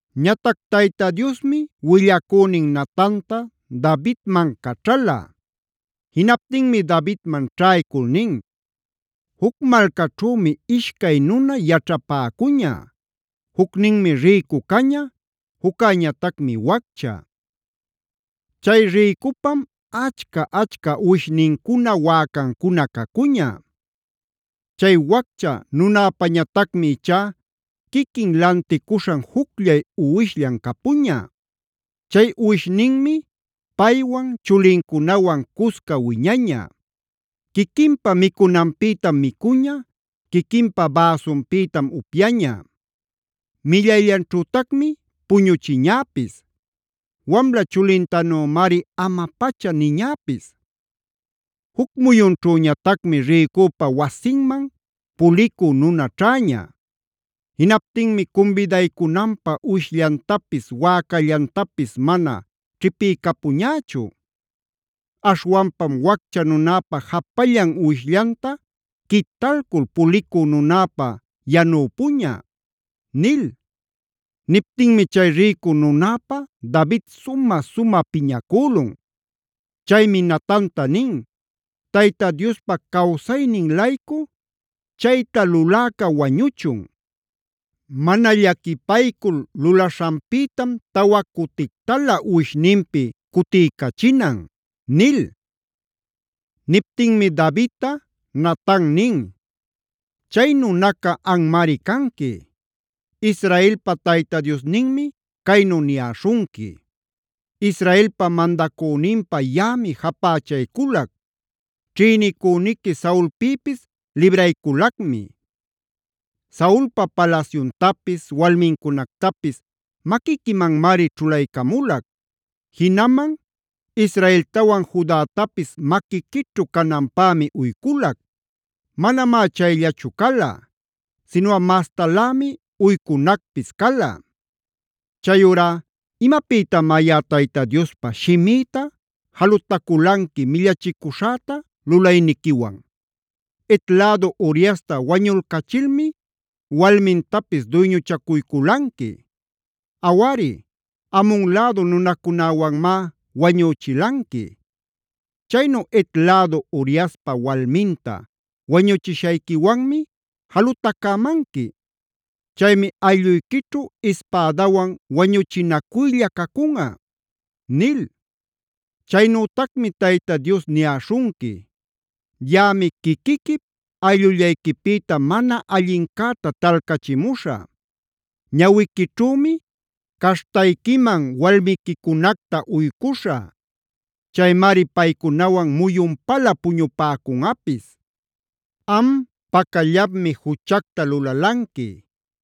Ñatac Tayta Diosmi willacünin Natantaa Davidman caćhala. Jinaptinmi Davidman ćhaycul nin: “Juc malcaćhümi ishcay nuna yaćhapäcuña. Jucninmi rïcu caña, juccäñatacmi waccha. Chay rïcupam achca-achca uwishnincuna, wäcancuna cacuña. Chay waccha nunäpañatacmi ichá quiquin lanticuśhan jucllay uwishllan capuña. Chay uwishninmi paywan, chulincunawan cusca wiñaña. Quiquinpa micunanpïtam micuña, quiquinpa bäsunpïtam upyaña, millayllanćhütacmi puñuchiñäpis. Wamla chulintanümari ama-pacha niñäpis. Juc muyunćhüñatacmi rïcupa wasinman pulicü nuna ćhäña. Jinaptinmi cumbidaycunanpä uwishllantapis, wäcallantapis mana ćhipiycapuñächu. Aśhwanpam waccha nunäpa japallan uwishllanta quitalcul pulicü nunäpä yanüpuña” nil. Niptinmi chay rïcu nunäpä David sumä-sumä piñacülun. Chaymi Natanta nin: “¡Tayta Diospa cawsaynin-laycu, chayta luläca wañuchun! Mana llaquipaycul lulaśhanpïtam tawa cutictalä uwishninpi cutiycachinan” nil. Niptinmi Davidta Natan nin: “¡Chay nunaca anmari canqui! Israelpa Tayta Diosninmi caynu niyäśhunqui: ‘Israelpa mandacüninpä yaꞌami japächayculac; ćhïnicüniqui Saulpïpis librayculacmi. Saulpa palasyuntapis, walmincunactapis maquiquimanmari ćhulaycamulac. Jinaman Israeltawan Judatapis maquiquićhu cananpämi uyculac. Manamá chayllachu cala, sinuꞌa mastalämi uycunacpis cala. Chayurá ¿imapïtamá yaꞌa Tayta Diospa shimïta jalutaculanqui millachicuśhäta lulayniquiwan? Het lädu Uriasta wañulcachilmi walmintapis duyñuchacuyculanqui. Awari Amon lädu nunacunäwanmá wañüchilanqui. Chaynu Het lädu Uriaspa walminta wañuchishayquiwanmi jalutacämanqui. Chaymi aylluyquićhu ispädawan wañuchinacuylla cacunꞌa’ nil. Chaynütacmi Tayta Dios niyäśhunqui: ‘Yaꞌami quiquiquip ayllullayquipïta mana allincäta talcachimuśhä. Ñawiquićhümi caśhtayquiman walmiquicunacta uycuśhä. Chaymari paycunawan muyunpalä puñupäcunꞌapis. Am pacallapmi juchacta lulalanqui;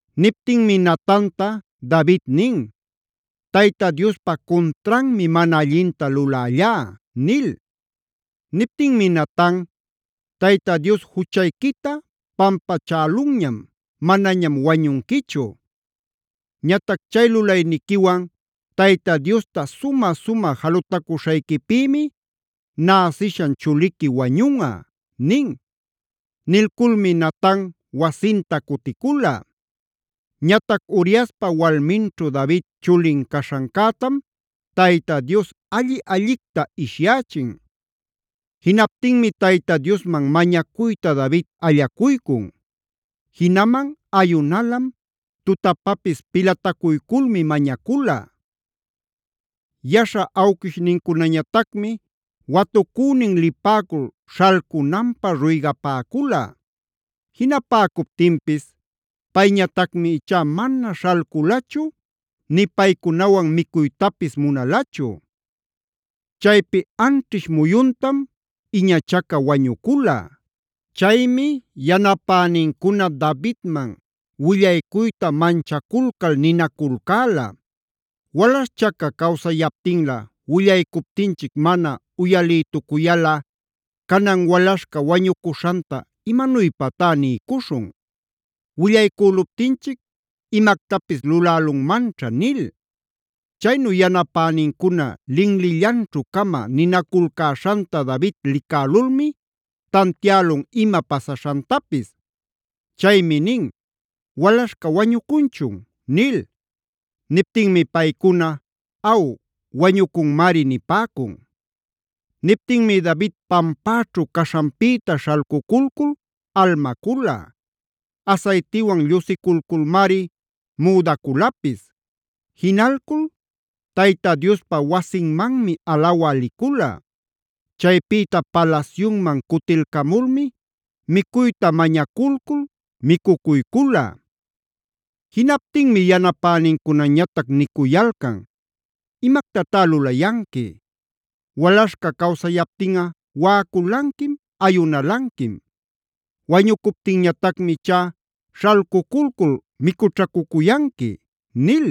Niptinmi Natanta David nin: “¡Tayta Diospa cuntranmi mana allinta lulällá!” nil. Niptinmi Natan: “Tayta Dios juchayquita pampachälunñam; manañam wañunquichu. Ñatac chay lulayniquiwan Tayta Diosta sumä-sumä jalutacuśhayquipïmi näsishan chuliqui wañunꞌa” nin. Nilculmi Natan wasinta cuticula. Ñatac Uriaspa walminćhu David chulin caśhancätam Tayta Dios alli-allicta ishyächin. Jinaptinmi Tayta Diosman mañacuyta David allacuycun; jinaman ayunalam, tutapapis pilatacuyculmi mañacula. Yaśha awquishnincunañatacmi watucünin lipäcul śhalcunanpä ruygapäcula. Jinapäcuptinpis payñatacmi ichá mana śhalculachu nïtac paycunawan micuytapis munalachu. Chaypi anćhish muyuntam iñachaca wañucula. Chaymi yanapänincuna Davidman willaycuyta manchaculcal ninaculcäla: “Walaśhchaca cawsayaptinlä willaycuptinchic mana uyalïtucuyalꞌa, canan walaśhca wañucuśhanta ¿imanuypatá niycuśhun? Willaycüluptinchic imactapis lulälunmanćha” nil. Chaynu yanapänincuna linlillanćhu-cama ninaculcäśhanta David licälulmi tantiälun ima pasaśhantapis. Chaymi nin: “¿Walaśhca wañucunchun?” nil. Niptinmi paycuna: “Aw, wañucunmari” nipäcun. Niptinmi David pampäćhu caśhanpïta śhalcuculcul almacula; asaytiwan llusiculculmari müdaculapis. Jinalcul Tayta Diospa wasinmanmi alawä licula. Chaypïta palasyunman cutilcamulmi micuyta mañaculcul micucuycula. Jinaptinmi yanapänincunañatac nicuyalcan: “¿Imactatá lulayanqui? Walaśhca cawsayaptinꞌa waꞌaculanquim, ayunalanquim. Wañucuptinñatacmi ichá śhalcuculcul micućhacucuyanqui” nil.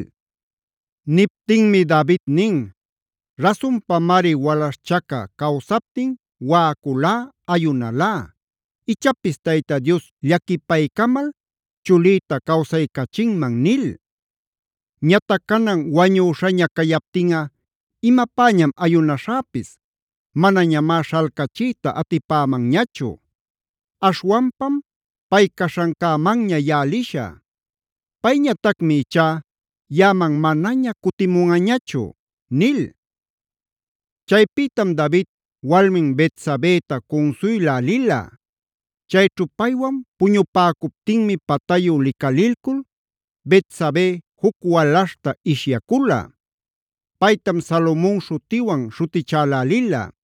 Niptinmi David nin: “Rasunpamari walaśhchaca cawsaptin waꞌaculá, ayunalá: ‘Ichapis Tayta Dios llaquipaycamal chulïta cawsaycachinman’ nil. Ñatac canan wañüśhaña cayaptinꞌa ¿imapäñam ayunaśhäpis? Manañamá śhalcachiyta atipämanñachu. Aśhwanpam pay caśhancämanña yaꞌa liśhä. Payñatacmi ichá yaꞌaman manaña cutimunꞌañachu” nil. Chaypïtam David walmin Betsabeta cunsuylä lila. Chayćhu paywan puñupäcuptinmi patayu licalilcul Betsabé juc walaśhta ishyacula. Paytam Salomon śhutiwan śhutichälälila.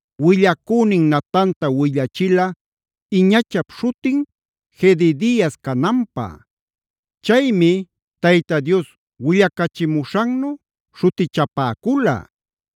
willacünin Natanta willachila iñachap śhutin Jedidiasc cananpä. Chaymi Tayta Dios willacachimuśhannu śhutichapäcula.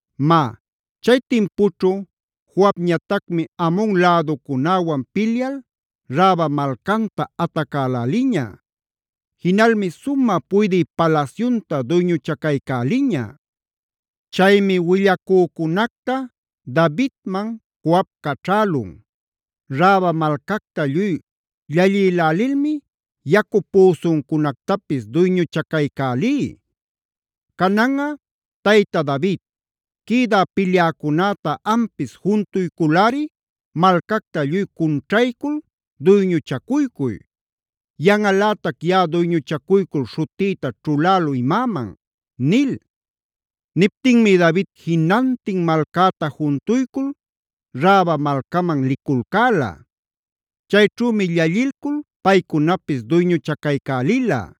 Má, chay timpućhu Joabñatacmi Amon läducunäwan pilyal Raba malcanta atacäläliña. Jinalmi sumä puydï palasyunta duyñuchacaycäliña. Chaymi willacücunacta Davidman Joab caćhälun: “Raba malcacta lluy llallïlälilmi yacu püsuncunactapis duyñuchacaycälí. Cananꞌa tayta David quïdä pilyäcunäta ampis juntuyculꞌari malcacta lluy cunćhaycul duyñuchacuycuy. Yanꞌalätac yaꞌa duyñuchacuycul śhutïta ćhulälü imäman” nil. Niptinmi David jinantin malcäta juntuycul Raba malcaman liculcäla. Chayćhümi llallilcul paycunapis duyñuchacaycälila.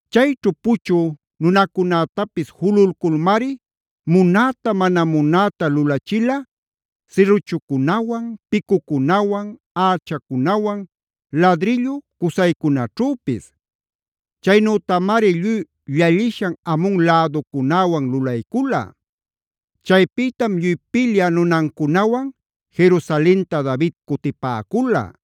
Chayćhu puchü nunacunätapis jululculmari munäta mana munäta lulachila: sirruchucunawan, picucunawan, ächacunawan, ladrillu cusaycunaćhüpis. Chaynütamari lluy llallishan Amon läducunäwan lulaycula. Chaypïtam lluy pilyä nunancunawan Jerusalenta David cutipäcula.